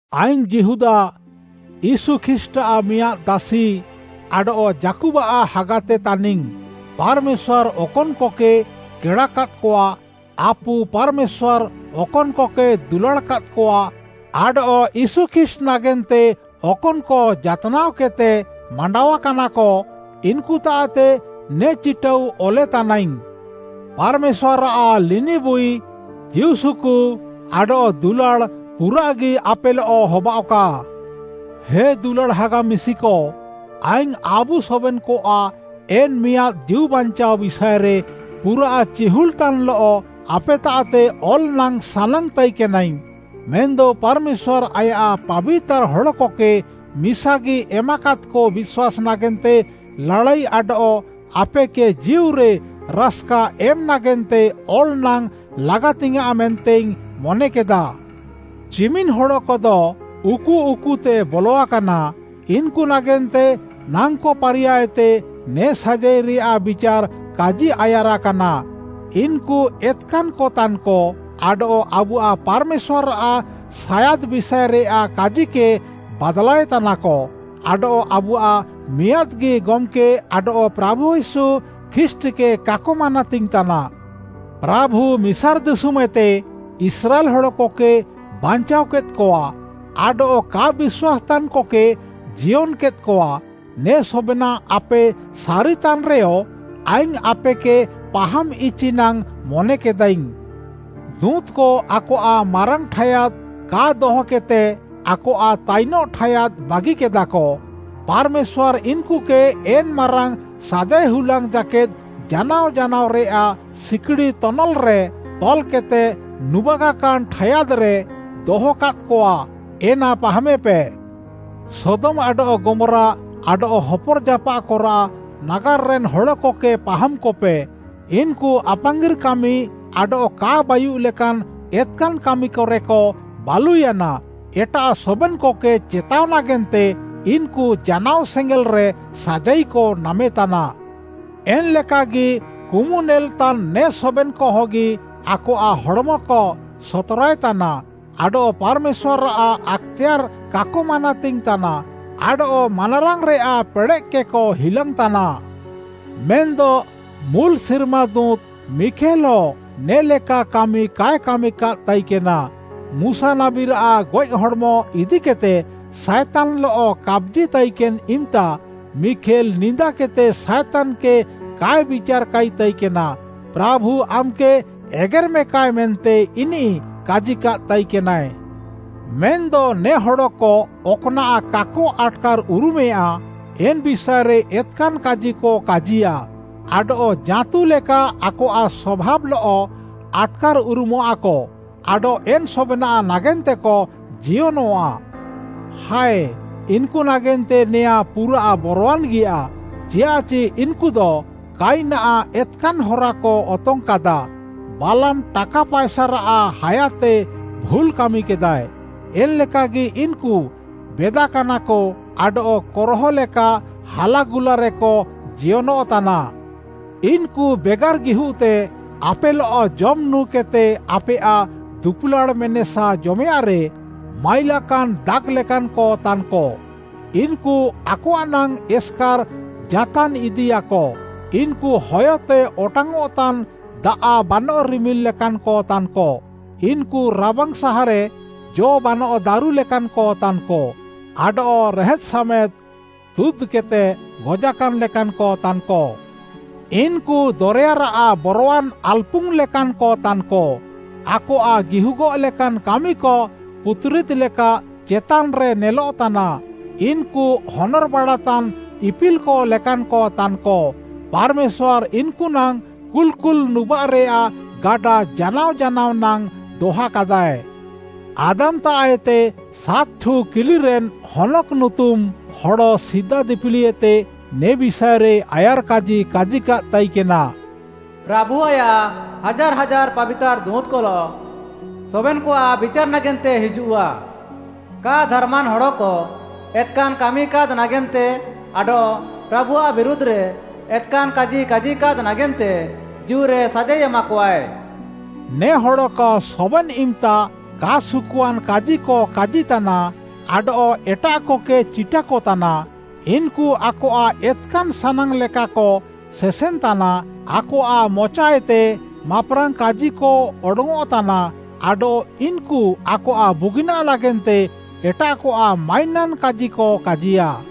ଆଇଙ୍ଗ୍‌ ଯିହୁଦା, ୟୀଶୁ ଖ୍ରୀଷ୍ଟ୍‌ଆଃ ମିଆଁଦ୍‌ ଦାସି, ଆଡଃ ଯାକୁବ୍‌ଆଃ ହାଗାତେ ତାନିଙ୍ଗ୍‌। ପାର୍‌ମେଶ୍ୱାର୍‌ ଅକନ୍‌କକେ କେଡ଼ାକାଦ୍‌କଆ, ଆପୁ ପାର୍‌ମେଶ୍ୱାର୍‌ ଅକନ୍‌କକେ ଦୁଲାଡ଼୍‌କାଦ୍‌କଆ, ଆଡଃ ୟୀଶୁ ଖ୍ରୀଷ୍ଟ୍‌ ନାଗେନ୍ତେ ଅକନ୍‌କ ଜାତ୍‌ନାଅକେଦ୍‌ତେ ମାଣ୍ଡାଅକାନାକ, ଇନ୍‌କୁତାଃତେ ନେ ଚିଟାଉ ଅଲେତାନାଇଙ୍ଗ୍‌। ପାର୍‌ମେଶ୍ୱାର୍‌ଆଃ ଲିନିବୁଇ, ଜୀଉସୁକୁ, ଆଡଃ ଦୁଲାଡ଼୍‌ ପୁରାଃଗି ଆପେଲଃ ହବାଃଅକା। ହେ ଦୁଲାଡ଼୍‌ ହାଗା ମିଶିକ, ଆଇଙ୍ଗ୍‌ ଆବୁ ସବେନ୍‌କଆଃ ଏନ୍‌ ମିଆଁଦ୍‌ ଜୀଉବାଞ୍ଚାଅ ବିଷାଏରେ ପୁରାଃ ଚିହୁଲ୍‌ତାନ୍‌ଲଃ ଆପେତାଃତେ ଅଲ୍‌ ନାଙ୍ଗ୍‌ ସାନାଙ୍ଗ୍‌ ତାଇକେନାଇଙ୍ଗ୍‌। ମେନ୍‌ଦ ପାର୍‌ମେଶ୍ୱାର୍‌ ଆୟାଃ ପାବିତାର୍‌ ହଡ଼କକେ ମିସାଗି ଏମାକାଦ୍‌କ ବିଶ୍ୱାସ୍‌ ନାଗେନ୍ତେ ଲାଡ଼ାଇ ଆଡଃ ଆପେକେ ଜୀଉରେ ରାସ୍‌କା ଏମ୍‌ ନାଗେନ୍ତେ ଅଲ ନାଙ୍ଗ୍‌ ଲାଗାତିଙ୍ଗ୍‌ୟାଁଃ ମେନ୍ତେଇଙ୍ଗ୍‌ ମନେକେଦା। ଚିମିନ୍‌ ହଡ଼କଦ ଉକୁଉକୁତେକ ବଲଆକାନା, ଇନ୍‌କୁ ନାଗେନ୍ତେ ନାଙ୍କ ପାରିୟାଏତେ ନେ ସାଜାଇରେୟାଃ ବିଚାର୍‌ କାଜିଆୟାରାକାନା। ଇନ୍‌କୁ ଏତ୍‌କାନ୍‌କତାନ୍‌କ ଆଡଃ ଆବୁଆଃ ପାର୍‌ମେଶ୍ୱାର୍‌ଆଃ ସାୟାଦ୍‌ ବିଷାଏରେୟାଃ କାଜିକେ ବାଦ୍‌ଲାଏତାନାକ। ଆଡଃ ଆବୁଆଃ ମିଆଁଦ୍‌ଗି ଗମ୍‌କେ ଆଡଃ ପ୍ରାଭୁ ୟୀଶୁ ଖ୍ରୀଷ୍ଟ୍‌କେ କାକ ମାନାତିଙ୍ଗ୍‌ ତାନା। ପ୍ରାଭୁ ମିସାର୍‌ ଦିଶୁମ୍‌ଏତେ ଇସ୍ରାଏଲ୍‌ ହଡ଼କକେ ବାଞ୍ଚାଅକେଦ୍‌କଆ, ଆଡଃ କା ବିଶ୍ୱାସ୍‌ତାନ୍‌କକେ ଜିୟନ୍‌କେଦ୍‌କଆ ନେ ସବେନାଃ ଆପେ ସାରିତାନ୍‌ରେୟ, ଆଇଙ୍ଗ୍‌ ଆପେକେ ପାହାମ୍‌ଇଚି ନାଙ୍ଗ୍‌ ମନେକେଦାଇଙ୍ଗ୍‌। ଦୁଁତ୍‌କ ଆକଆଃ ମାରାଙ୍ଗ୍‌ ଠାୟାଦ୍‌ କା ଦହକେଦ୍‌ତେ ଆକଆଃ ତାଇନଃ ଠାୟାଦ୍‌ ବାଗିକେଦାକ। ପାର୍‌ମେଶ୍ୱାର୍‌ ଇନ୍‌କୁକେ ଏନ୍‌ ମାରାଙ୍ଗ୍‌ ସାଜାଇହୁଲାଙ୍ଗ୍‌ ଜାକେଦ୍‌ ଜାନାଅ ଜାନାଅରେୟାଃ ସିକ୍‌ଡ଼ି ତନଲ୍‌ରେ ତଲ୍‌କେଦ୍‌ତେ ନୁବାଗାକାନ୍‌ ଠାୟାଦ୍‌ରେ ଦହକାଦ୍‌କଆ, ଏନା ପାହାମେପେ। ସୋଦମ୍‌ ଆଡଃ ଗମ୍‌ରା, ଆଡଃ ହପର୍‌ଜାପାଃକରାଃ ନାଗାର୍‌ରେନ୍‌ ହଡ଼କକେ ପାହାମ୍‌କପେ। ଇନ୍‌କୁ ଆପାଙ୍ଗିର୍‌କାମି ଆଡଃ କା ବାୟୁଃଲେକାନ୍‌ ଏତ୍‌କାନ୍‌କାମିକରେକ ବାଲୁୟାନା। ଏଟାଃ ସବେନ୍‌କକେ ଚେତାଅ ନାଗେନ୍ତେ ଇନ୍‌କୁ ଜାନାଅ ସେଙ୍ଗେଲ୍‌ରେ ସାଜାଇକ ନାମେତାନା। ଏନ୍‌ଲେକାଗି, କୁମୁନେଲ୍‌ତାନ୍‌ ନେ ସବେନ୍‌କହଗି ଆକଆଃ ହଡ଼୍‌ମକ ସତ୍‌ରାଏତାନା, ଆଡଃ ପାର୍‌ମେଶ୍ୱାର୍‌ଆଃ ଆକ୍‌ତେୟାର୍‌ କାକ ମାନାତିଙ୍ଗ୍‌ ତାନା ଆଡଃ ମାନାରାଙ୍ଗ୍‌ରେୟାଃ ପେଡ଼େଃକେକ ହିଲାଙ୍ଗ୍‌ ତାନା। ମେନ୍‌ଦ ମୁଲ୍‌ ସିର୍ମାଦୁତ୍‌ ମିଖେଲ୍‌ହ ନେ'ଲେକା କାମି କାଏ କାମିକାଦ୍‌ ତାଇକେନା। ମୁଶା ନାବୀରାଃ ଗଏଃ ହଡ଼୍‌ମ ଇଦିକେଦ୍‌ତେ ସାଏତାନ୍‌ଲଃ କାପ୍‌ଜିତାଇକେନ୍‌ ଇମ୍‌ତା ମିଖେଲ୍‌ ନିନ୍ଦାକେଦ୍‌ତେ ସାଏତାନ୍‌କେ କାଏ ବିଚାର୍‌କାଇ ତାଇକେନା। ପ୍ରାଭୁ ଆମ୍‌କେ ଏଗେର୍‌ମେକାଏ ମେନ୍ତେ ଇନିଃ କାଜିକାଦ୍‌ ତାଇକେନାଏ। ମେନ୍‌ଦ ନେ ହଡ଼କ ଅକ୍‌ନାଃ କାକ ଆଟ୍‌କାର୍‌ଉରୁମେୟାଁ ଏନ୍‌ ବିଷାଏରେ ଏତ୍‌କାନ୍‌ କାଜିକ କାଜିୟା, ଆଡଃ ଜାଁତୁ ଲେକା ଆକଆଃ ସଭାବ୍‌ଲଃ ଆଟ୍‌କାର୍‌ଉରୁମଃଆକ, ଆଡଃ ଏନ୍‌ ସବେନାଃ ନାଗେନ୍ତେକ ଜିୟନଃଆ। ହାଏ, ଇନ୍‌କୁ ନାଗେନ୍ତେ ନେଆଁଁ ପୁରାଃ ବରୱାନ୍‌ଗିୟା, ଚିୟାଃଚି ଇନ୍‌କୁଦ କୟିନ୍‌ଆଃ ଏତ୍‌କାନ୍‌ ହରାକ ଅତଙ୍ଗ୍‌କାଦା। ବାଲାମ୍‌ ଟାକା ପାଏସାରାଃ ହାୟାତେ ଭୁଲ୍‌ କାମିକେଦାଏ। ଏନ୍‌ଲେକାଗି ଇନ୍‌କୁ ବେଦାକାନାକ ଆଡଃ କୋରହ ଲେକା ହାଲାଗୁଲାରେକ ଜିୟନଃତାନା। ଇନ୍‌କୁ ବେଗାର୍‌ ଗିହୁଃତେ ଆପେଲଃ ଜମ୍‌ ନୁଁ କେଦ୍‌ତେ ଆପେୟାଃ ଦୁପୁଲାଡ଼୍‌ ମେନେସା ଜମେୟାଃଁରେ ମାଇଲାକାନ୍‌ ଦାଗ୍‌ଲେକାନ୍‌କ ତାନ୍‌କ। ଇନ୍‌କୁ ଆକଆଃନାଙ୍ଗ୍‌ ଏସ୍‌କାର୍‌ ଜାତାନ୍‌ଇଦିୟାକ, ଇନ୍‌କୁ ହୟତେ ଅଟାଙ୍ଗ୍‌ଅଃତାନ୍‌ ଦାଆଃ ବାନଃ ରିମିଲ୍‌ ଲେକାନ୍‌କ ତାନ୍‌କ। ଇନ୍‌କୁ ରାବାଙ୍ଗ୍‌ ସାହାରେ ଜ ବାନଃ ଦାରୁ ଲେକାନ୍‌କ ତାନ୍‌କ, ଆଡଃ ରେହେଦ୍‌ସାମେଦ୍‌ ତୁଦ୍‌କେଦ୍‌ତେ ଗଜାକାନ୍‌ ଲେକାନ୍‌କ ତାନ୍‌କ। ଇନ୍‌କୁ ଦରେୟାରାଃ ବରୱାନ୍‌ ଆଲ୍‌ପୁଙ୍ଗ୍‌ ଲେକାନ୍‌କ ତାନ୍‌କ, ଆକଆଃ ଗିହୁଗଃ ଲେକାନ୍‌ କାମିକ ପୁତ୍‌ରିଦ୍‌ ଲେକା ଚେତାନ୍‌ରେ ନେଲଃତାନା। ଇନ୍‌କୁ ହନର୍‌ବାଡ଼ାତାନ୍‌ ଇପିଲ୍‌କ ଲେକାନ୍‌କ ତାନ୍‌କ, ପାର୍‌ମେଶ୍ୱାର୍‌ ଇନ୍‌କୁନାଙ୍ଗ୍‌ କୁଲ୍‌କୁଲ୍‌ ନୁବାଃରେୟାଃ ଗାଡ଼ା ଜାନାଅ ଜାନାଅ ନାଙ୍ଗ୍‌ ଦହାକାଦାଏ। ଆଦାମ୍‌ତାଃଏତେ ସାତ୍‌ଠୁ କିଲିରେନ୍‌ ହନୋକ୍‌ ନୁତୁମ୍‌ ହଡ଼ ସିଦା ଦିପିଲିଏତେ ନେ ବିଷାଏରେ ଆୟାର୍‌କାଜି କାଜିକାଦ୍‌ ତାଇକେନା: “ପ୍ରାଭୁ ଆୟାଃ ହାଜାର୍‌ ହାଜାର୍‌ ପାବିତାର୍‌ ଦୁଁତ୍‌କଲଃ ସବେନ୍‌କଆଃ ବିଚାର୍‌ ନାଗେନ୍ତେ ହିଜୁଃଆ। କା ଧାର୍‌ମାନ୍‌ ହଡ଼କ ଏତ୍‌କାନ୍‌ କାମିକାଦ୍‌ ନାଗେନ୍ତେ ଆଡଃ ପ୍ରାଭୁଆଃ ବିରୁଧ୍‌ରେ ଏତ୍‌କାନ୍‌ କାଜି କାଜିକାଦ୍‌ ନାଗେନ୍ତେ ଜୀଉରେ ସାଜାଇ ଏମାକଆଏ।” ନେ ହଡ଼କ ସବେନ୍‌ ଇମ୍‌ତା କା ସୁକୁଆନ୍‌ କାଜିକ କାଜିତାନା ଆଡଃ ଏଟାଃକକେ ଚିଟାକ ତାନା। ଇନ୍‌କୁ ଆକଆଃ ଏତ୍‌କାନ୍‌ ସାନାଙ୍ଗ୍‌ଲେକାକ ସେସେନ୍‌ତାନା, ଆକଆଃ ମଚାଏତେ ମାପ୍‌ରାଙ୍ଗ୍‌ କାଜିକ ଅଡଙ୍ଗ୍‌ଅଃତାନା ଆଡଃ ଇନ୍‌କୁ ଆକଆଃ ବୁଗିନାଃ ନାଗେନ୍ତେ ଏଟାଃକଆଃ ମାଇନାନ୍‌ କାଜିକ କାଜିୟାଃ।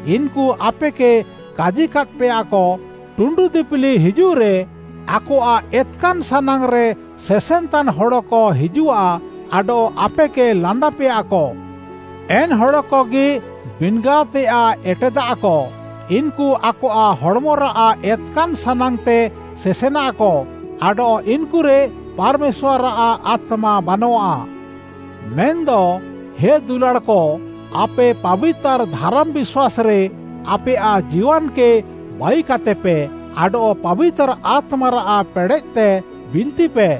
ଇନ୍‌କୁ ଆପେକେ କାଜିକାଦ୍‌ପେୟାକ, “ଟୁଣ୍ଡୁ ଦିପିଲି ହିଜୁଃରେ, ଆକଆଃ ଏତ୍‌କାନ୍‌ ସାନାଙ୍ଗ୍‌ରେ ସେସେନ୍‌ତାନ୍‌ ହଡ଼କ ହିଜୁଃଆ ଆଡଃ ଆପେକେ ଲାନ୍ଦାପେୟାକ।” ଏନ୍‌ ହଡ଼କଗି ବିନ୍‌ଗାଅତେୟାଃ ଏଟେଦାଃକ। ଇନ୍‌କୁ ଆକଆଃ ହଡ଼୍‌ମରାଃ ଏତ୍‌କାନ୍‌ ସାନାଙ୍ଗ୍‌ତେ ସେସେନାଃକ ଆଡଃ ଇନ୍‌କୁରେ ପାର୍‌ମେଶ୍ୱାର୍‌ଆଃ ଆତ୍ମା ବାନଃଆ। ମେନ୍‌ଦ ହେ ଦୁଲାଡ଼୍‌କ, ଆପେ ପାବିତାର୍‌ ଧାରାମ୍‌ ବିଶ୍ୱାସ୍‌ରେ ଆପେୟାଃ ଜୀୱାନ୍‌କେ ବାଇକାତେପେ, ଆଡଃ ପାବିତାର୍‌ ଆତ୍ମାରାଃ ପେଡ଼େଃତେ ବିନ୍ତିପେ।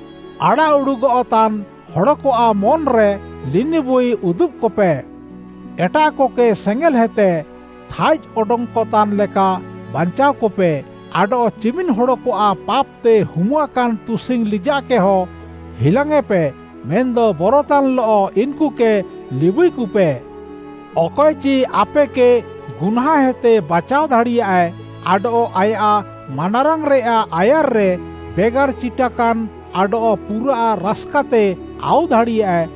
ଆଡ଼ାଃଉଡ଼ୁଃଗଃ ତାନ୍‌ ହଡ଼କଆଃ ମନ୍‌ରେ ଲିନିବୁଇ ଉଦୁବ୍‌କପେ; ଏଟାଃକକେ ସେଙ୍ଗେଲ୍‌ହେତେ ଥାଇଜ୍‌ ଅଡଙ୍ଗ୍‌କତାନ୍‌ ଲେକା ବାଞ୍ଚାଅକପେ, ଆଡଃ ଚିମିନ୍‌ ହଡ଼କଆଃ ପାପ୍‌ତେ ହୁମୁଆକାନ୍‌ ତୁସିଙ୍ଗ୍‌ ଲିଜାଃକେହ ହିଲାଙ୍ଗ୍‌ୟେଁପେ, ମେନ୍‌ଦ ବରତାନ୍‌ଲଃ ଇନ୍‌କୁକେ ଲିବୁଇକପେ। ଅକଏଚି ଆପେକେ ଗୁହ୍ନାଁଁଏତେ ବାଚାଅ ଦାଡ଼ିୟାଏ, ଆଡଃ ଆୟାଃ ମାନାରାଙ୍ଗ୍‌ରେୟାଃ ଆୟାର୍‌ରେ ବେଗାର୍‌ ଚିଟାକାନ୍‌ ଆଡଃ ପୁରାଃ ରାସ୍‌କାତେ ଆଉ ଦାଡ଼ିୟାଏ,